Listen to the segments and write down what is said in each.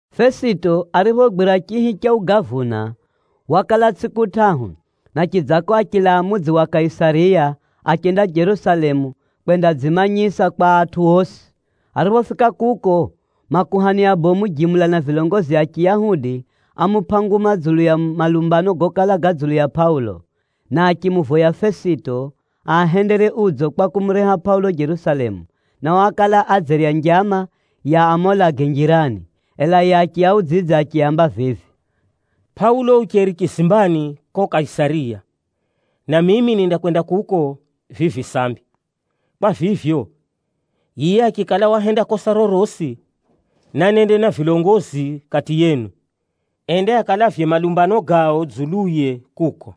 Fesito ariphogwira chihi cha ugavuna, wakala tsʼiku tʼahu, na chidzako achilaa mudzi wa Kaisariya, achenda Jerusalemu kwendadzimanyisa kwa atʼu osi. Ariphofika kuko, makuhani abomu jimula na vilongozi a Chiyahudi, ámupʼa nguma dzulu ya malumbano gokala ga dzulu ya Pʼaulo. Na achimuvoya Fesito aahendere udzo kwa kumureha Pʼaulo Jerusalemu, nao ákala adzerya njama ya amuulage njirani. Ela yiye achiaudzidza achiaamba vivi, “Pʼaulo ucheri chizimbani ko Kaisariya, na mimi nindakwenda kuko vivi sambi. Kwa vivyo, yiye achikala wahenda kosa rorosi, nanende na vilongozi kati yenu, ende akalavye malumbano gao dzuluye kuko.”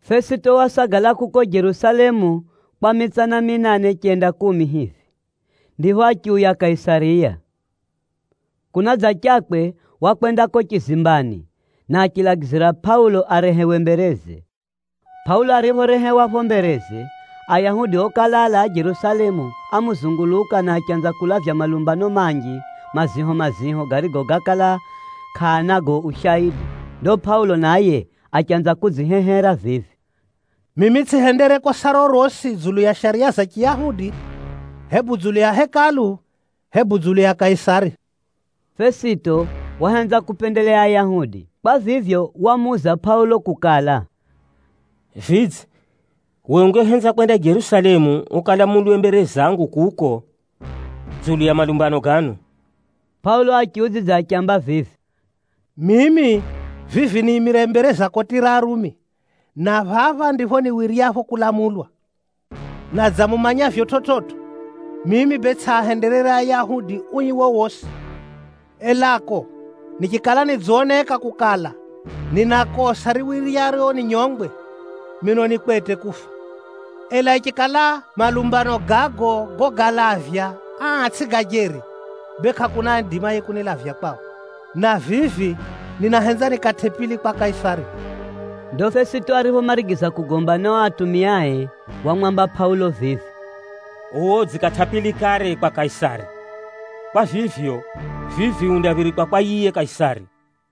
Fesito wasagala kuko Jerusalemu kwa mitsana minane, chenda kumi hivi, ndipho achiuya Kaisariya. Kunadzachakwe, wakwenda ko chizimbani, na achilagizira Pʼaulo arehewe mbereze. Pʼaulo ariphorehewa pho mbereze, Ayahudi okala alaa Jerusalemu ámuzunguluka na achanza kulavya malumbano manji maziho-maziho, garigo gákala kʼaanago ushaidi. Ndo Pʼaulo naye achanza kudzihehera vivi, “Mimi tsʼihendere kosa rorosi dzulu ya shariya za Chiyahudi, hebu dzulu ya Hekalu, hebu dzulu ya Kaisari.” Fesito wahenza kupendeleya Ayahudi. Kwa vivyo, wamuuza Pʼaulo kukala, “Vidze, we ungehenza kwenda Jerusalemu ukalamulwe mbere zangu kuko dzulu ya malumbano gano?” Pʼaulo achiudzidza achiamba vivi, “Mimi vivi niimire mbere za koti ra Arumi, na phapha ndipho niwiryapho kulamulwa. Na dza mumanyavyo chividzo, mimi bee tsʼiahenderere Ayahudi ui wowosi. Elako, nichikala nidzoneka kukala, nina kosa riwiryaro ninyongwe, mino ni kwete kufa. Ela ichikala malumbano gago gogalavya aa tsʼi ga jeri, bee kʼakuna aidimaye kunilavya kwao. Na vivi, ninahenza nikatʼe pili kwa Kaisari.” Ndo Fesito ariphomarigiza kugomba na o atumiae, wamwamba Pʼaulo vivi, “Uwe udzikatʼa pili kare kwa Kaisari. Kwa vivyo, vivi undaphirikwa kwa yiye Kaisari.”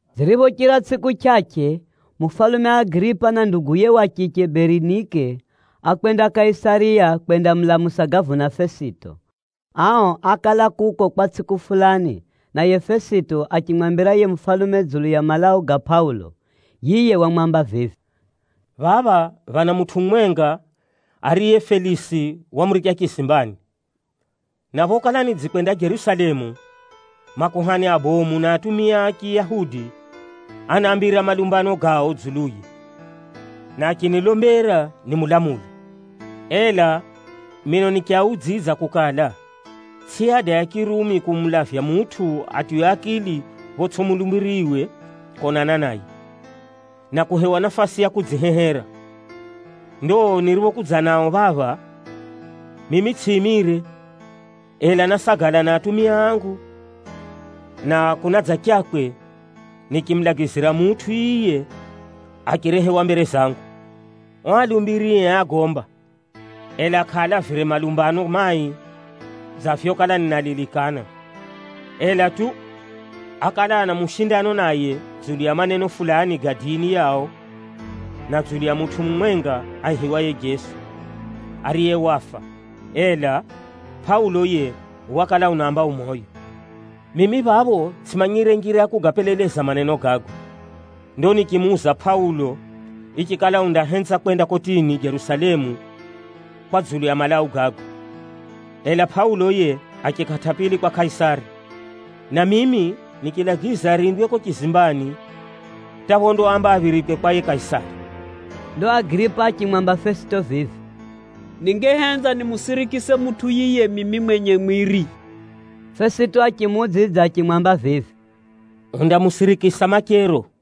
Ziriphochira tsʼiku chʼachʼe, mufalume Agiripa na nduguye wa chiche Berinike, ákwenda Kaisariya kwendamulamusa gavuna Fesito. Ao ákala kuko kwa tsʼiku fulani, naye Fesito achimwambira yiye mufalume dzulu ya malau ga Pʼaulo. Yiye wamwamba vivi, “Phapha phana mutʼu mumwenga ariye Felisi wamuricha chizimbani. Na phokala nidzikwenda Jerusalemu, makuhani abomu na atumia a Chiyahudi ánambira malumbano gao dzuluye, na achinilombera nimulamule. Ela mino nichiaudzidza kukala, tsʼi ada ya Chirumi kumulavya mutʼu atiywe akili photsʼi mulumbiriwe konana naye, na kuhewa nafasi ya kudzihehera. Ndo niriphokudza nao phapha, mimi tsʼiimire, ela násagala na atumia angu, na kunadzachakwe nichimulagizira mutʼu yiye achirehewa mbere zangu. O alumbirie ágomba, ela kʼaalavire malumbano mai dza vyokala ninalilikana. Ela tu, ákala ana mushindano naye dzulu ya maneno fulani ga dini yao, na dzulu ya mutʼu mumwenga aihiwaye Jeso, ariye wafa, ela Pʼaulo yiye wakala unaamba u moyo. Mimi phapho tsʼimanyire njira ya kugapeleleza maneno gago. Ndo nichimuuza Pʼaulo ichikala undahenza kwenda kotini Jerusalemu kwa dzulu ya malau gago. Ela Pʼaulo yiye achikatʼa pili kwa Kaisari, na mimi nichilagiza arindwe ko chizimbani hata phondaamba aphirikwe kwa yiye Kaisari.” Ndo Agiripa achimwamba Fesito vivi, “Ningehenza nimusirikise mutʼu yiye mimi mwenye mwiri.” Fesito achimuudzidza achimwamba vivi, “Undamusirikisa machero.”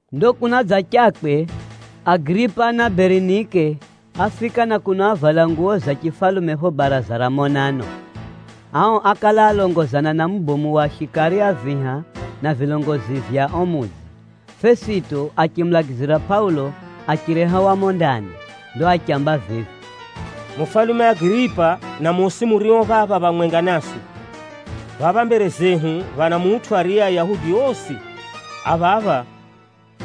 Ndo kunadzachakwe, Agiripa na Berinike áfika na kuno avala nguwo za chifalume pho baraza ra monano. Ao ákala alongozana na mubomu wa shikari a viha na vilongozi vya o mudzi. Fesito achimulagizira Pʼaulo achirehewa mumo ndani. Ndo achiamba vivi, “Mufalume Agiripa na mosi murio phapha phamwenga naswi! Phapha mbere zehu phana mutʼu, ariye Ayahudi osi a phapha,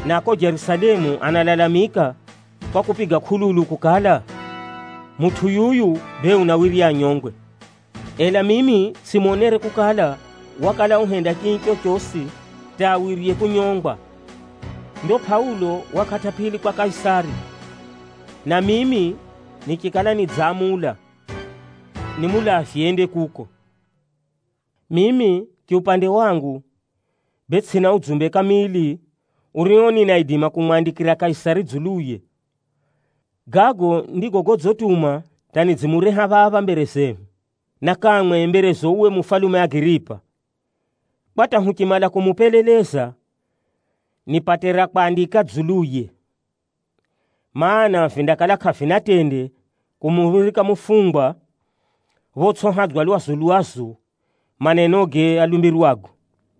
na a ko Jerusalemu analalamika kwa kupiga kʼululu kukala, mutʼu yuyu bee unawirya anyongwe. Ela mimi tsʼimonere kukala, wakala uhenda chii chochosi hata awirye kunyongwa. Ndo Pʼaulo wakatʼa pili kwa Kaisari, na mimi nichikala nidzamula nimulavye ende kuko. Mimi chiupande wangu, bee tsʼina udzumbe kamili urio ninaidima kumwandikira Kaisari dzuluye. Gago ndigo godzituma hata nidzimureha phapha mbere zehu, na kamwe mberezo uwe mufalume Agiripa, kwa hata huchimala kumupeleleza, nipate ra kwandika dzuluye. Maana, vindakala kʼavina tende kumuphirika mufungwa photsʼihadza lwazu-lwazu manenoge alumbirwago.”